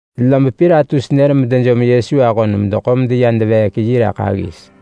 Lob Pilatus nër medejom Yesu ahon medeḳo meya deveek yi raḳ aggis.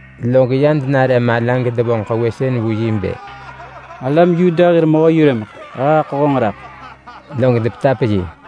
log ya denare mala gedevonġ kewësën vu bë, “Alam Yuda hir mehö-yurëmeḳ! He haḳo honġ raḳ!” Log depetap yi.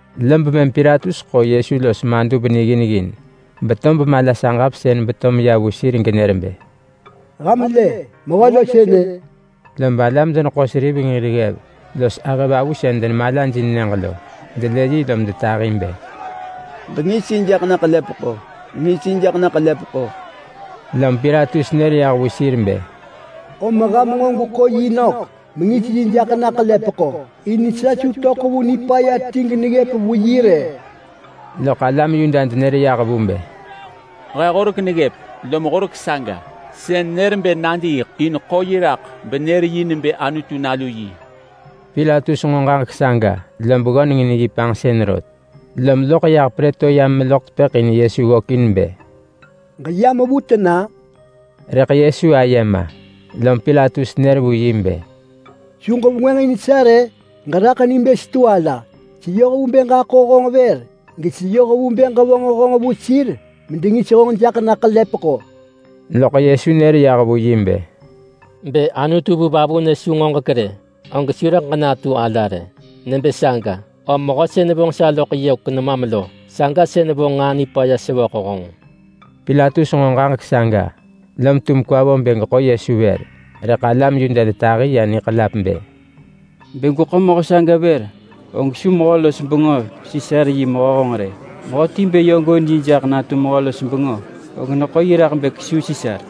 Lob mëm Pilatus ḳo Yesu los madub niggin ggin, betob mala saġap sën beto meya vu sir genër bë, “Ham lë! Mehö lo sënë!” Lob alam-deneḳo-seriveng hir ggev los ahëvavu sën denemalajin nyëġ lo, delë yi lom detahi bë, “Ġengis yi jaḳ na ḳelepeḳo! Ġengis yi jaḳ na ḳelepeḳo!” Lom Pilatus nër yah vu sir bë, “Om ham nġo gweḳo yi nök mengis yi jaḳ na ḳelepeḳo. In sa su töḳ vu nipaya ti geneggëp vu yi rë.” Loḳ alam Yuda denër yah vu bë, “He horek neggëp lom horek saga sën nër bë nadiiḳ in ḳo yi raḳ benër yi nebë Anutu Nalu yi.” Pilatus nġo ġaġek saga, lob ggöneng in yi panġsën rot, lom loḳ yah Prëtoryam meloḳ tepëḳ in Yesu ggökin bë, “Ġeyam vu tena?” Rëḳ Yesu aye ma. Lom Pilatus nër vu yi bë, “Su ġevengwënġ in sa rë? Ġeraḳ ni bë setu ala! Seyoh vu bë ġaḳo honġ vër, geseyoh vu bë ġevonġ honġ vu sir medengis honġ jaḳ na ḳelepeḳo!” Loḳ Yesu nër yah vu yi bë, “Bë Anutu vu vavunë su ngoġek rë, og su rëḳ ġenatu ala rë. Nebë saga, om mehö sën vonġ sa loḳ yök nemam lo, saga sën vonġ nġaa nipaya sevöḳ honġ.” Pilatus nġo ġaġek saga, lom tum kwa vo bë geḳo Yesu vër, rëḳ alam Yuda detahi ya niḳelap bë, “Bë gweḳo mehö saga vër, og su mehö-los-bengö Sisar yi mehö honġ rë! Mehöti bë yö gooin yi jaḳ natu mehö-los-bengö, og neḳo yi raḳ bë kesuu Sisar.”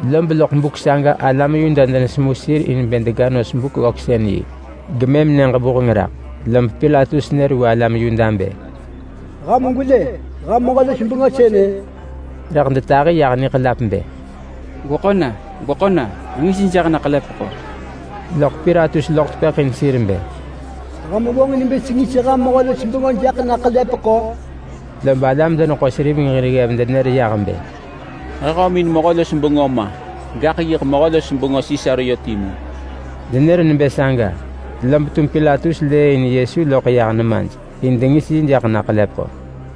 Lob loḳ buk saga alam Yuda denesemu sir in bë dega nos Buk-ggöksën-yi, gemëm siks krök monbuk lob Pilatus nër vu alam Yuda bë, “Ham gwelë ham mehö-los-bengö sënë!” Rëḳ detahi yah niḳelap bë, “Gweḳo na! Gweḳo na! Ġengis yi jaḳ na ḳelepeḳo!” Loḳ Pilatus loḳ tepëḳ in sir bë, “Ham vonġin bë sengis ham mehö-los-bengö jaḳ na ḳelepeḳo?” Lob alam-deneḳo-seriveng hir ggev denër yah bë, “He hömin mehö-los-bengö ma, gaḳ yiḳ mehö-los-bengö Sisar yö timu!” Denër nebë saga, lob tum Pilatus lëëin Yesu loḳ yah nemaj in dengis yi jaḳ na ḳelepeḳo.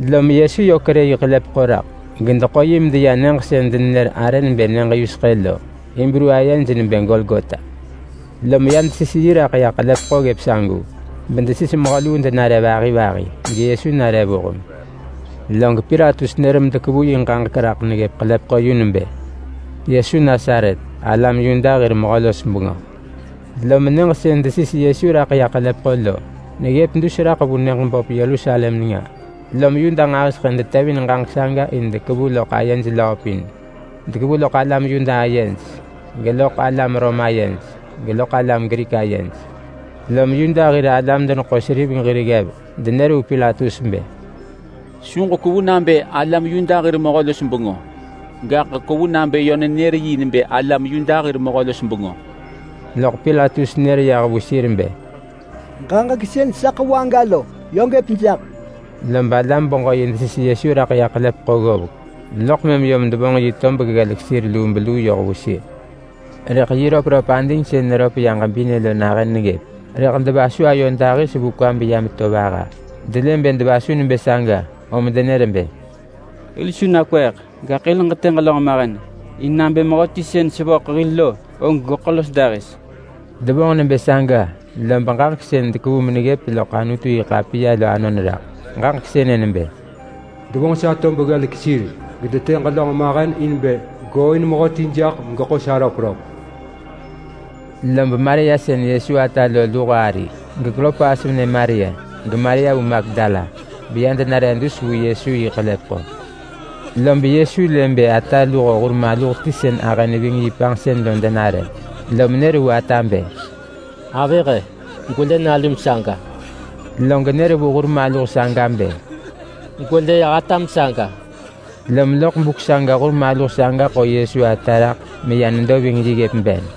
Lom Yesu yö kerë yi ḳelepeḳo raḳ gedeḳo yi medeya nyëġ sën denenër arë nebë Nyëġ Yuseḳë lo, (Hibru ayej nebë Golgota). Lom ya desis yi raḳ ḳelepeḳo ggëp sagu, bedesis mehö luu denare vahi vahi, geYesu nare vuheng. Log Pilatus nër medekevu yi ġaġek raḳ neggëp ḳelepeḳo yu nebë: YESU NASARET, ALAM YUDA HIR MEHÖ-LOS-BENGÖ. Lom nyëġ sën desis Yesu raḳ ya ḳelepeḳo lo, neggëp dus vu nyëġ böp Yerusalem nenga, lom Yuda nġahiseḳë detevin ġaġek saga in dekevu loḳ ayej löö pin. Dekevu loḳ alam Yuda ayej, geloḳ alam Rom ayej, geloḳ alam Grik ayej. Lom Yuda hir alam-deneḳo-seriveng hir ggev denër vu Pilatus bë, “Su ġekwevu nabë alam Yuda hir mehö-los-bengö, gaḳ kwevu nabë yö nenër yi nebë alam Yuda hir mehö-los-bengö.” Loḳ Pilatus nër yah vu sir bë, “Ġaġek sën sa ḳevu aga lo, yö gëp jaḳ!” Lob alam-beġö-yi desis Yesu raḳ ya ḳelepeḳo ggovek, loḳ mëm yom devonġ yi tob ggelek sir ya yu lubeluu yoh vu sir. Rëḳ yi röpröp ading sën neröp ya ġebinë lo nahën neggëp, rëḳ devasu los ayo dahis vu kwa beya meto vaha. Delë bë devasu nebë saga, om denër bë, “Hil su nakweeḳ, gaḳ hil ġetë ġelönġ mahen in nabë mehöti sën sevöḳ hil lo, og geḳo los dahis.” Devonġ nebë saga lob ġaġek sën dekevu meneggëp loḳ Anutu-yi-ḳapiya lo anon raḳ. Ġaġek sënë nebë: “Devonġ sa tob ggelek sir. Gedetë ġelönġ mahen in bë gooin mehöti jaḳ megeḳo sa röpröp.” Lob Maria sën Yesu ata lo luho ari, geKlopas venë Maria, geMaria vu Magdala, beya denare dus vu Yesu yi ḳelepeḳo. Lob Yesu lë bë ata luho hur maluh ti sën ahë neving yi panġsën lo denare, lom nër vu ata bë, “Avëh-e! Gwelë nalum saga!” Log nër vu hur maluh saga bë, “Gwelë atam saga!” Lom loḳ buk saga hur maluh saga ḳo Yesu ata raḳ meya nedo ving yi ggëp ben.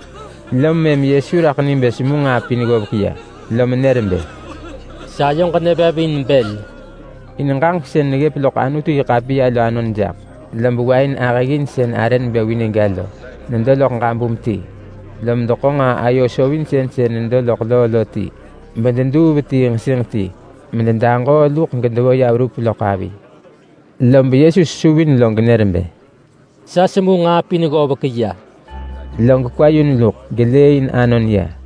Lom mëm Yesu raḳ ni bë semu nġaa pin ggovek ya, lom nër bë, “Sayoġ nevev in bël!” in ġaġek sën neggëp loḳ Anutu-yi-ḳapiya lo anon jaḳ. Lob wain ahëggin sën arë nebë vinegga lo nedo loḳ ġabum ti. Lom deḳo nġaa-ayo-sovinsën sën nedo loḳ loo lo ti, bededuu vetii nġesinġ ti mededaġoo luḳ gedevo ya verup loḳ avi. Lob Yesu sesuvin log nër bë, “Sa semu nġaa pin ggovek ya!” Log kwa yun luḳ gelëëin anon ya.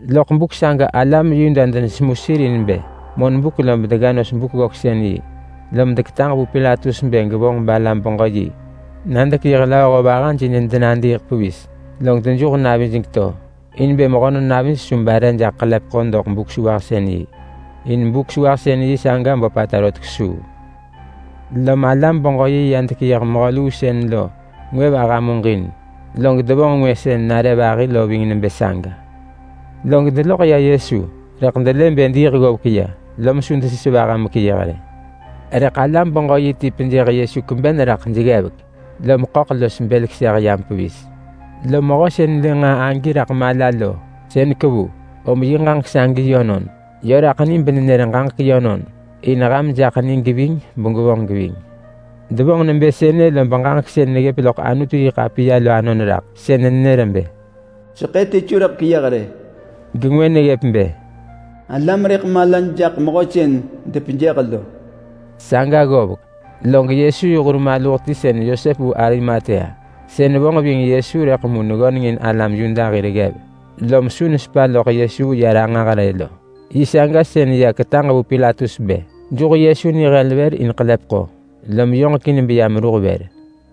Loḳ buk saga alam Yuda denesemu sir in bë monbuk lob dega nos Buk-ggöksën-yi, lom deketaġ vu Pilatus bë gevonġ alam-beġö-yi na dekeyëh lööho vahaj in denadiiḳ pevis, log dejuh navij geto. In bë mehönon navij su bare jaḳ ḳelepeḳo doḳ Buk-sewahsën-yi, in Buk-sewahsën-yi saga böpata rot kesuu. Lom alam-beġö-yi ya dekeyëh mehö luu sën lo ngwë vaha muġin, log devonġ ngwë sën nare vahi lo ving nebë saga. Log deloḳ ya Yesu, rëḳ delë bë diiḳ ggovek ya, lom su desis vaha mekeyëh rë. Rëḳ alam-beġö-yi ti pejëh Yesu kweben raḳ jeggevek lom ḳöḳ los bël keseh yam pevis. Lom mehö sën lë nġaa agi raḳ mala lo, sën kevu, om yi ġaġek sagi yönon. Yö raḳ ni benenër ġaġek yönon in ham jaḳ ni geving begwevonġ geving. Devonġ nebë sënë lob ġaġek sën neggëp loḳ Anutu-yi-ḳapiya lo anon raḳ. Sën nenër bë: “Seḳë ti su rëḳ keyëh rë.” Gengwë neggëp bë: “Alam rëḳ malaj jaḳ mehö sën depejëh lo.” Saga ggovek log Yesu yi hur maluh ti sën Yosep vu Arimatea, sën vonġ ving Yesu rëḳ mu neggöneng in alam Yuda hir ggev lom su nesepa loḳ Yesu ya ranġah rë lo. Yi saga sën ya ketaġ vu Pilatus bë juh Yesu nihel vër in ḳelepeḳo, lom yoġekin beya meruh vër.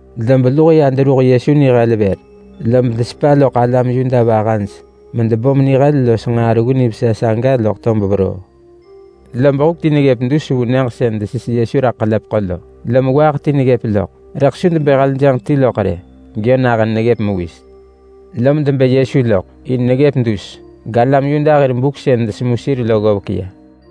Lob luho ya deruh Yesu vër lob desepa loḳ alam Yuda vahaj medebom nihel los nġaa reggu nivesa saga loḳ tob veroo. Lob huk ti neggëp dus vu nyëġ sën desis Yesu raḳ ḳelepeḳo lo, lom waaḳ ti neggëp loḳ, rëḳ su debë heljënġ ti loḳ rë, geyö nahën neggëp mewis. Lom debë Yesu loḳ, in neggëp dus, galam Yuda hir buk sën desemu sir lo ggovek ya.